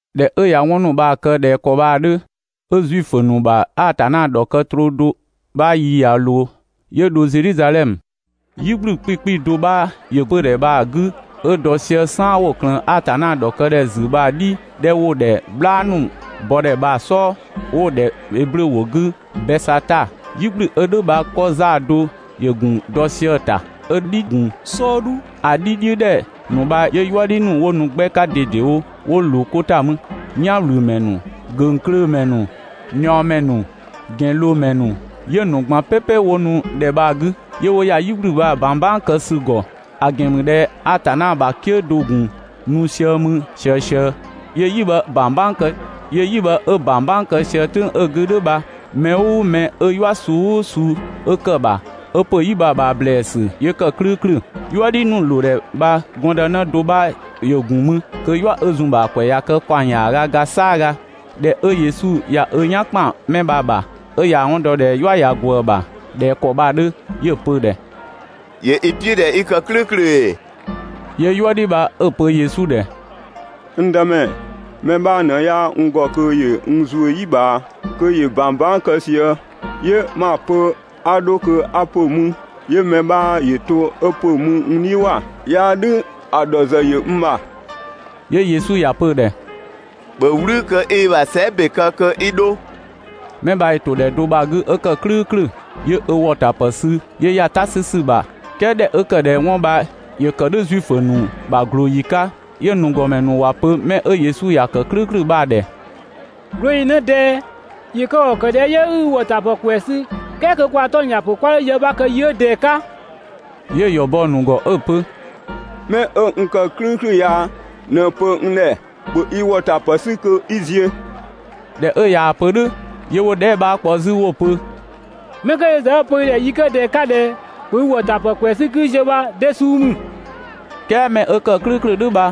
꞊Dhɛ 'ö ꞊ya 'wɔn ‑nu bha‑ kë ꞊dhɛ ‑kɔ bha‑ 'dhö, 'ö Zuifö ‑nu ‑bha Atanna ‑dhɔkë troo do 'bha yi ꞊ya ꞊loo, 'yö dho Zedhizadhɛmö. "Yi ꞊gblü 'kpikpi do 'bha ‑yö 'pödhɛ bha‑ 'gü 'ö dɔ sië "saan 'wo‑ ꞊klëën Atanna ‑dhɔkë ‑dhɛ ‑zü bha‑ "dhi 'dhɛ 'wo‑ ‑dhɛ "bhlaa ‑nu bɔdhɛ bha‑ "sɔɔ, 'ö 'wo‑ ‑dhɛ Eblö ‑wʋ 'gü Bɛsata. "Yi ꞊gblü 'ö "dhʋ̈ bha 'kɔ 'zaa‑ do 'bha‑ ‑gun dɔ sië‑ ‑ta 'ö‑ "dhi‑ gun "sɔɔdhu. ‑A "dhi "dhiʋ̈ ‑dhɛ ‑nu bha 'yö "yuëdhi ‑nu 'wo nu 'gbɛ 'ka ꞊dedewo 'wo ꞊loo 'ko ‑ta mü. "Yanwlümɛ ‑nu, ‑göngklöömɛ ‑nu, ꞊niɔɔmɛ ‑nu, ‑gɛnloomɛ ‑nu, 'yö‑ ‑nu ꞊gban "pɛpɛ 'wo nu ‑dhɛ bha‑ 'gü, ['yö 'wo ‑ya "yi ꞊gblü bha‑ ꞊bang "bang kë ‑sü ‑gɔ. ‑A ‑gɛn ‑mü ꞊dhɛ Atanna ‑bha "kië do 'bha‑ ‑gun nu sië 'mü ꞊siësië 'yö "yi bha‑ ꞊bang "bang ‑kë. 'Yö "yi bha 'ö ꞊bang "bang kë sië "tʋ̈ng 'ö‑ 'gü "dhʋ̈ bha, mɛ "ʋʋ mɛ 'ö "yua suu "ʋʋ suu 'ö ‑kë ‑bha, 'ö ‑pö "yi bha‑ ꞊bhaa ‑blɛɛsü, 'yö ‑kë "klʋ̈ʋ̈klʋ̈]. "Yuëdhi ‑nu ꞊loo ‑dhɛ bha gɔndënë do 'bha ‑yö ‑gun mü, kö "yua 'ö zun‑ ‑bha ‑a ‑kwɛ ꞊ya kë ‑kaɔng ‑yaaga ga "saaga. ꞊Dhɛ 'ö Yesu ꞊ya ö "yan ‑kpan 'mɛ bha‑ ‑bha, 'ö ꞊yaa‑ 'wɔn dɔ ꞊dhɛ "yua ꞊ya ꞊gwëë‑ ‑bha ꞊dhɛ ‑kɔ bha‑ 'dhö, 'yö‑ pö‑ ‑dhɛ: «‑Yö i "piʋ̈ ꞊dhɛ 'i kë "klʋ̈ʋ̈klʋ̈ ‑ee?» 'Yö "yuëdhi bha 'ö‑ pö Yesu ‑dhɛ: «N Dëmɛ, mɛ 'bha ꞊në 'yaa n ‑gɔ kö ‑yö n ‑zuö "yi ꞊bhaa kö ‑yö ꞊bang "bang kë sië, 'yö 'ma‑ pö 'a 'dho kö 'a ‑pö mü, 'yö mɛ 'bha ‑yö to 'ö ‑pö mü n "dhiʋ̈ ‑wa, 'yaa "dhʋ̈ ‑a ‑dhɔ ‑zë ‑yö n ‑bha.» 'Yö Yesu ‑ya pö‑ ‑dhɛ: «‑Bhö "wlü kö 'i i ‑bha sɛɛ" ‑be kë kö 'i 'dho!» 'Mɛ bha ‑yö ‑to ‑dhɛ do bha‑ 'gü 'ö kë "klʋ̈ʋ̈klʋ̈. 'Yö ö ‑wɔtapë sü 'yö ‑ya "ta 'sü ‑sü ‑bha. "Kɛɛ ꞊dhɛ 'ö ‑kë ꞊dhɛ 'wɔn bha ‑yö ‑kë "dhʋ̈ Zuifö ‑nu ‑bha ꞊glooyi 'ka, 'yö‑ ‑nu ‑gɔmɛ ‑nu ‑wa pö 'mɛ 'ö Yesu ‑ya ‑kë "klʋ̈ʋ̈klʋ̈ bha‑ ‑dhɛ: «꞊Glooyi ꞊në ꞊dɛɛ, ‑yö kë ‑kɔ ‑kë ꞊dhɛ 'yö 'i i ‑wɔtapë ‑kwɛɛ sü "kɛɛ kö kwaa‑ 'tɔng‑ ‑ya ‑pö 'kwa 'dho yë 'bha kë yi 'ö ꞊dɛɛ‑ 'ka?» 'Yö‑ ‑yɔ bɔ‑ ‑nu ‑gɔ 'ö‑ pö: «'Mɛ 'ö n ‑kë "klʋ̈ʋ̈klʋ̈ ya ꞊në‑ pö n ‑dhɛ: «‑Bhö i ‑wɔtapë 'sü kö 'i ziö!» ꞊Dhɛ 'ö ꞊yaa‑ pö "dhʋ̈ 'yö 'wo‑ dhɛɛ" 'bha kpɔ 'zü 'wo‑ pö: «'Mɛ 'kö yö ‑zë 'ö‑ pö i ‑dhɛ yi 'kö ꞊dɛɛ‑ 'ka ꞊dhɛ «‑bhö i ‑wɔtapë 'sü 'kii ziö» bha de suu ‑mü?» "Kɛɛ 'mɛ 'ö ‑kë "klʋ̈ʋ̈klʋ̈ "dhʋ̈ bha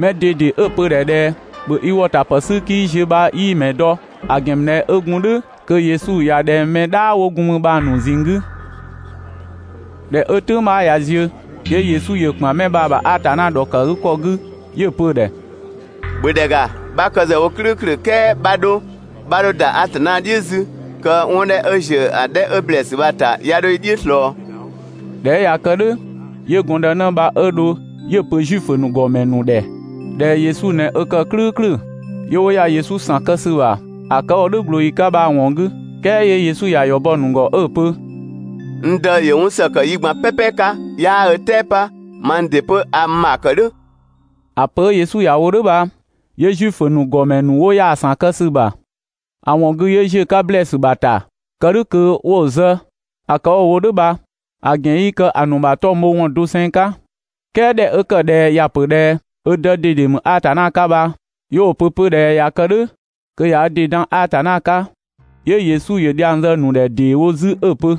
mɛ ꞊dede 'ö‑ pö‑ ‑dhɛ ꞊dhɛ «‑bhö i ‑wɔtapë 'sü 'kii ziö» bha 'yii‑ ‑mɛ dɔ, ‑a ‑gɛn ‑mü ꞊dhɛ 'ö gun "dhʋ̈ kö Yesu ꞊ya ꞊dhɛng mɛ "dhaa 'wo gun mü bha‑ ‑nu ꞊zinng 'gü. ꞊Dhɛ 'ö "tʋ̈ng 'bha ꞊ya ziö, 'yö Yesu ‑yö ‑kpan 'mɛ bha‑ ‑bha Atanna ‑dhɔkëgükɔ 'gü 'yö‑ pö‑ ‑dhɛ: «‑Bhö ‑dhɛ ‑ga, 'bha kë ‑zë wo "klʋ̈ʋ̈klʋ̈ "kɛɛ 'bha 'dho, 'bha 'dho ‑da Atanna "dhiʋ̈ 'zü, kö 'wɔn 'dhɛ 'ö ‑ziö 'dhɛ 'ö ‑blɛɛsü bha‑ ‑ta 'ya 'dho i "dhiʋ̈ ꞊slɔɔ!» ꞊Dhɛ 'ö ꞊ya kë "dhʋ̈ 'yö gɔndënë bha 'ö dho 'yö‑ pö Zuifö ‑nu ‑gɔmɛ ‑nu ‑dhɛ ꞊dhɛ Yesu ꞊nɛ ö ‑kë "klʋ̈ʋ̈klʋ̈. 'Yö 'wo ‑ya Yesu ‑san kë ‑sü ‑bha ‑a kë 'ö‑ wo "dhʋ̈ ꞊glooyi 'ka bha‑ ‑wɔn 'gü. "Kɛɛ 'yö Yesu ‑ya ‑yɔ bɔ‑ ‑nu ‑gɔ 'ö‑ pö: «N Dë ‑yö 'wɔn ‑së ‑kë yi ꞊gban "pɛpɛ 'ka ('yaa ö "tɛɛ 'pa), mang ‑dɩ 'pö a n ‑bha ‑kë "dhʋ̈. ‑A pö 'ö Yesu ‑ya wo "dhʋ̈ bha 'yö Zuifö ‑nu ‑gɔmɛ ‑nu 'wo ‑ya ‑san kë ‑sü ‑bha ‑a ‑wɔn 'gü 'yö ‑ziö 'ka ‑blɛɛsü ‑bha ‑ta, kë "dhʋ̈ kö 'wo‑ zë. ‑A kë 'wo‑ wo "dhʋ̈ bha‑ ‑gɛn 'yii kë‑ ‑nu ‑bha 'tɔng‑ bho ‑wɔn doseng 'ka, "kɛɛ ꞊dhɛ 'ö ‑kë ꞊dhɛ ‑ya ‑pö 'pö ꞊dhɛ ö Dë ꞊dede ‑mü Atanna 'ka bha, 'yö 'wo‑ pö 'pö ꞊dhɛ ꞊ya kë "dhʋ̈ kö ꞊ya ö ‑dɩ dan Atanna 'ka. 'Yö Yesu ‑yö dhiang zë‑ ‑nu ‑dhɛ ‑dee wo 'zü 'ö‑ pö: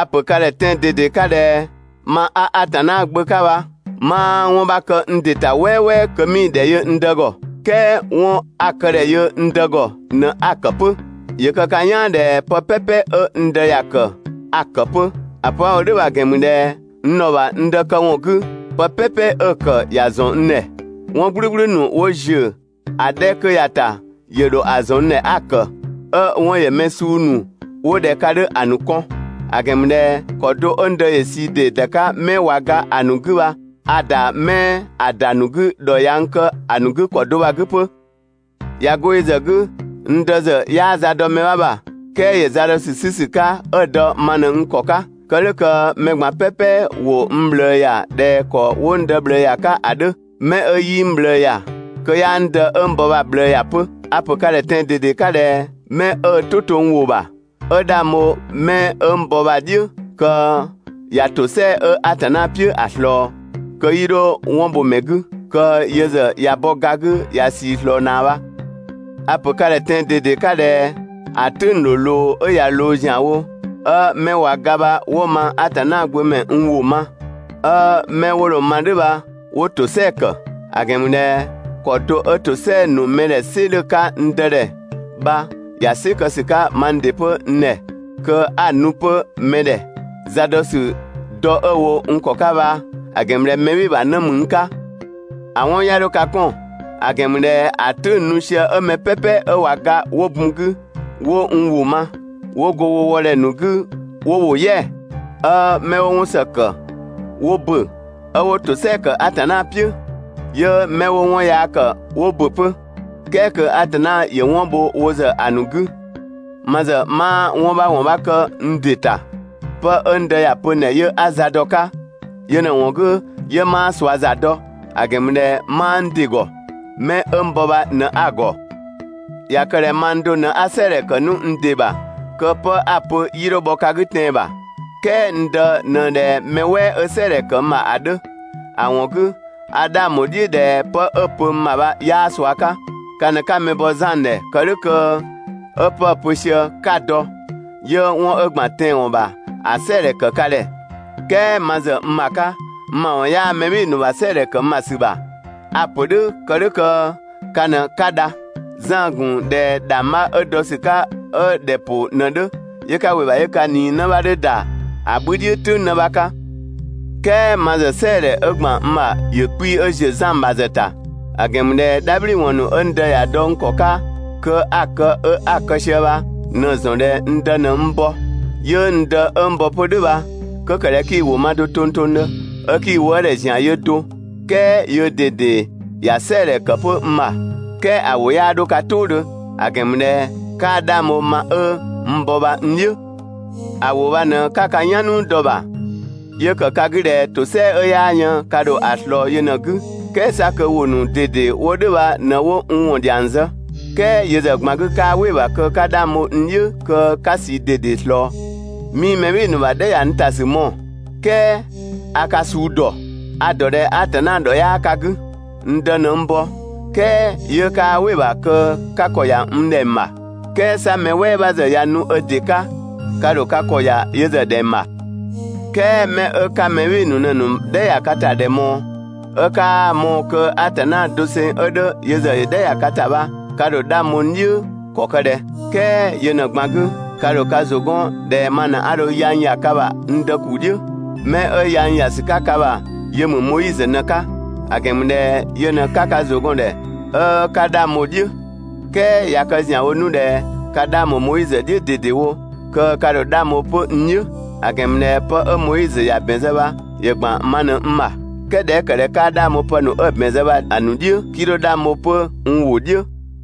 «A‑ ‑pö ka ‑dhɛ tɛan‑ ꞊dede 'ka ꞊dhɛ: Ma 'a Atanna Gbö 'ka bha 'maa 'wɔn 'bha kë n ‑dɩ ‑ta "wɛɛwɛɛ kö 'mii‑ ‑dhɛ yö n Dë ‑gɔ, "kɛɛ 'wɔn 'a‑ këdhɛ yö n Dë ‑gɔ ꞊në 'a‑ ‑kë 'pö. ‑Yö kë ka "yaan ꞊dhɛ pë "pɛpɛ 'ö n Dë ‑ya ‑kë a‑ ‑kë 'pö. ‑A pö 'a‑ wo "dhʋ̈ bha‑ ‑gɛn ‑mü ꞊dhɛ n ‑dhɔ ‑bha n Dë këwɔn 'gü, pë "pɛpɛ 'ö‑ ‑kë ‑ya ‑zɔn n ‑dhɛ. 'Wɔn "gblʋ̈gblʋ̈ ‑nu 'wo ‑ziö ‑a 'dhɛ 'kö ya‑ ‑ta ‑yö ‑dho ‑a ‑zɔn n ‑dhɛ 'a‑ ‑kë 'ö‑ 'wɔn ‑yö mɛ suu ‑nu 'wo ꞊dhɛ ka 'dhö ‑a ‑nu kɔn. ‑A ‑gɛn ‑mü ꞊dhɛ ‑kɔ do 'ö n Dë ‑yö ꞊sii ‑dee ‑da 'ka 'mɛ ꞊wa ga ‑a ‑nu 'gü bha, a‑ ‑da 'mɛ ‑a ‑da ‑nu 'gü ‑dhɔ ꞊ya n kë‑ ‑nu 'gü ‑kɔ do bha‑ 'gü 'pö. ꞊Ya 'go yö ‑zë 'gü, n Dë ‑zë 'yaa za dɔ mɛ 'bha ‑bha, "kɛɛ ‑yö za dɔ ‑sü 'sü ‑sü 'ka 'ö‑ dɔ ma ꞊në n ‑kɔ 'ka. Kë "dhʋ̈ kö mɛ ꞊gban "pɛpɛ ‑wo n ꞊bhlëë ‑ya ꞊dhɛ ‑kɔ 'wo n Dë ꞊bhlëë ‑ya 'ka ‑a 'dhö. 'Mɛ 'ö 'yii n ꞊bhlëë ‑ya, kö 'yaa n Dë 'ö n bɔ bha‑ ꞊bhlëë ‑ya 'pö. A‑ pö ka ‑dhɛ tɛan‑ ꞊dede 'ka ꞊dhɛ 'mɛ 'ö ö "tʋ to n ‑wʋ ‑bha, 'ö 'dhang bho 'mɛ 'ö n bɔ bha‑ "dhiʋ̈, kö ꞊ya ‑tosɛa 'ö Atanna "piʋ̈ ‑a ꞊slɔɔ, kö 'yii 'dho 'wɔn bho‑ ‑mɛ 'gü, kö yö ‑zë ꞊ya bɔ ga 'gü ꞊ya ꞊sii ꞊slɔɔ ꞊naa bha. A‑ pö ka ‑dhɛ tɛan‑ ꞊dede 'ka ꞊dhɛ ‑a "tʋ̈ng ‑dho ꞊loo, 'ö ꞊ya ‑wo ‑zianwo, 'ö 'mɛ ꞊wa ga bha 'wo mang Atanna gbö ‑mɛ n ‑wʋ ma, 'ö 'mɛ 'wo dho‑ ma "dhʋ̈ bha 'wo ‑tosɛa ‑kë. ‑A ‑gɛn ‑mü ꞊dhɛ ‑kɔ do 'ö ‑tosɛa ‑nu mɛ ‑dhɛ "sɩ 'dhö‑ 'ka n Dë ‑dhɛ bha ‑ya "sɩ kë ‑sü 'ka mang ‑dɩ 'pö n ‑dhɛ, kö 'a‑ nu 'pö mɛ ‑dhɛ. Za dɔ ‑sü dɔ 'ö‑ wo n ‑kɔ 'ka bha‑ ‑gɛn ‑mü ꞊dhɛ mɛ "bhɩɩ‑ ‑bha 'në ‑mü n 'ka. ‑A 'wɔn 'ya 'dho ka 'kɔn, ‑a ‑gɛn ‑mü ꞊dhɛ ‑a "tʋ̈ng‑ nu sië 'ö mɛ "pɛpɛ 'ö ꞊wa ga 'wo bun 'gü, 'wo n ‑wʋ ma, 'ö 'wo go wo wɔdhɛ ‑nu 'gü 'wo ‑wo "yɛa‑, 'ö 'mɛ 'wo 'wɔn ‑së ‑kë 'wo ‑bö, 'ö 'wo ‑tosɛa ‑kë Atanna "piʋ̈. 'Yö 'mɛ 'wo 'wɔn yaa ‑kë 'wo ‑bö 'pö, "kɛɛ kö Atanna ‑yö 'wɔn bho wo ‑zë ‑a ‑nu 'gü. Ma ‑zë 'maa 'wɔn 'bha ‑wɔn 'bha kë n ‑dɩ ‑ta. 'Pë 'ö n Dë ‑ya pö n ‑dhɛ 'yö 'a za dɔ‑ 'ka. Yö ꞊në‑ ‑wɔn 'gü 'yö 'maa ꞊sua za dɔ, ‑a ‑gɛn ‑mü ꞊dhɛ 'maa n ‑dɩ ‑gɔ. 'Mɛ 'ö n bɔ bha ꞊në 'a‑ ‑gɔ. ꞊Ya kë ꞊dhɛ mang do ꞊në 'a "sɛɛdhɛ ‑kë 'nu n ‑dɩ ‑bha, kö 'pë 'a‑ pö 'yii 'dho bhɔ ka 'gü tɛan‑ ‑bha. "Kɛɛ n Dë ꞊në ꞊dhɛ mɛ "wɛɛ 'ö "sɛɛdhɛ ‑kë n ‑bha ‑a 'dhö. ‑A ‑wɔn 'gü, a 'dhang ‑bho "dhiʋ̈ ꞊dhɛ 'pë 'ö‑ pö n ‑bha bha 'yaa ꞊sua 'ka. Ka ꞊në 'ka mɛ bɔ Zan ‑dhɛ kë "dhʋ̈ kö 'ö 'pë‑ pö sië 'ka‑ dɔ, 'yö 'wɔn 'ö ‑gban tɛanwɔn ‑bha ‑a "sɛɛdhɛ ‑kë ka ‑dhɛ. "Kɛɛ ma ‑zë n ‑bha 'ka, ma ‑wɔn 'yaa mɛ "bhɩɩ‑ ‑nu ‑bha "sɛɛdhɛ ‑kë n ‑bha ‑sü ‑bha. A‑ ‑pö "dhʋ̈ kë "dhʋ̈ kö ka ꞊në 'ka dha. Zan‑ gun ꞊dhɛ ‑dhangbha 'ö dɔ ‑sü 'ka 'ö ‑dhɛ ‑pʋ ꞊në‑ 'dhö, 'yö 'ka ‑wɩ ‑bha 'yö ka ꞊nii 'në 'bha 'dhö ‑da ‑a 'bhü "dhiʋ̈ "tʋ̈ng 'në 'bha 'ka. "Kɛɛ ma ‑zë "sɛɛdhɛ 'ö ‑gban n ‑bha ‑yö 'kpii‑ 'ö ‑ziö Zan ‑bha ‑zë ‑ta, ‑a ‑gɛn ‑mü ꞊dhɛ "dhabhliwɔn ‑nu 'ö n Dë ‑ya dɔ n ‑kɔ 'ka kö 'a‑ kë, 'ö 'a‑ kë sië bha ꞊në‑ ‑zɔn ꞊dhɛ n Dë ꞊në n bɔ. 'Yö n Dë 'ö n bɔ 'pö "dhʋ̈ bha, 'kö ‑kë ꞊dhɛ 'kii‑ ‑wʋ ma do tongtongdhö, 'ö 'kii‑ wëëdhɛ ‑zian yö do, "kɛɛ yöö ꞊dede ‑ya "sɛɛdhɛ ‑kë 'pö n ‑bha. "Kɛɛ ‑a ‑wʋ 'yaa 'dho ka "tʋʋdhö, ‑a ‑gɛn ‑mü ꞊dhɛ 'kaa 'dhang bho ma 'ö n bɔ bha n "dhiʋ̈. ‑A ‑wʋ bha ꞊në 'ka ka "yan "nuu dɔ‑ ‑bha, 'yö ‑kë ka 'gü ꞊dhɛ ‑tosɛa 'ö 'yaa yën ka ‑dho ‑a ꞊slɔɔ yö ꞊në‑ 'gü, "kɛɛ 'sa kö ‑wʋ ‑nu ꞊dede 'wo "dhʋ̈ bha ꞊në 'wo n ‑wɔn ‑dhiang zë. "Kɛɛ yö ‑zë ꞊gban 'gü 'kaa "wɩ‑ ‑bha kö 'ka 'dhang bho n "dhiʋ̈ kö 'ka ꞊sii ꞊dede ꞊slɔɔ. 'Mii mɛ "bhɩɩ‑ ‑nu ‑bha "dhɛ ‑ya n ‑ta ‑sü mɔɔ‑, "kɛɛ a ka suu ‑dɔ. A‑ ‑dɔ ꞊dhɛ Atanna ‑dhɔ 'yaa ka 'gü. N Dë ꞊në n bɔ, "kɛɛ 'yö 'kaa "wɩ‑ ‑bha kö 'ka ‑kɔ ‑ya n ‑dhɛng ‑bha. "Kɛɛ 'sa mɛ "wɛɛ 'bha ‑zë ꞊ya nu ö ‑dɩ 'ka, ka ‑dho ka ‑kɔ ‑ya yö ‑zë ‑dhɛng ‑bha! "Kɛɛ mɛ 'ö 'ka mɛ "bhɩɩ‑ ‑nu ꞊në‑ ‑nu ‑bha "dhɛ ‑ya ka ‑ta ‑dhɛ ꞊mɔɔ, 'ö 'kaa‑ mɔɔ‑ kö Atanna doseng 'ö 'dhö yö ‑zë ‑yö "dhɛ ‑ya ka ‑ta bha ka ‑dho 'dhang bho n "dhiʋ̈ ‑kɔ ‑kë ꞊dhɛ? "Kɛɛ yö ꞊në‑ ꞊gban 'gü, 'ka 'dho ka ‑zʋ 'gɔn ꞊dhɛ ma ꞊në 'a dho yang ‑ya ka ‑bha n Dë ‑kuu "dhiʋ̈. 'Mɛ 'ö yang ‑ya ‑sü 'ka ka ‑bha yö ‑mü Moizö ꞊në‑ 'ka, ‑a ‑gɛn ‑mü ꞊dhɛ yö ꞊në 'ka ka ‑zʋ gɔn‑ ‑dhɛ 'ö 'ka 'dhang bho‑ "dhiʋ̈. "Kɛɛ ꞊ya kë ‑zianwo 'nu ꞊dhɛ ka 'dhang bho Moizö "dhiʋ̈ ꞊dedewo, kö ka ‑dho 'dhang bho 'pö n "dhiʋ̈. ‑A ‑gɛn ‑mü ꞊dhɛ 'pë 'ö Moizö ‑ya ‑bɛn zë bha ‑yö ‑gban ma ꞊në n ‑bha. "Kɛɛ ꞊dhɛ 'ö ‑kë ꞊dhɛ 'kaa 'dhang bho pë ‑nu 'ö‑ ‑bɛn zë bha‑ ‑nu "dhiʋ̈, 'kii dho 'dhang bho 'pö n ‑wʋ "dhiʋ̈.»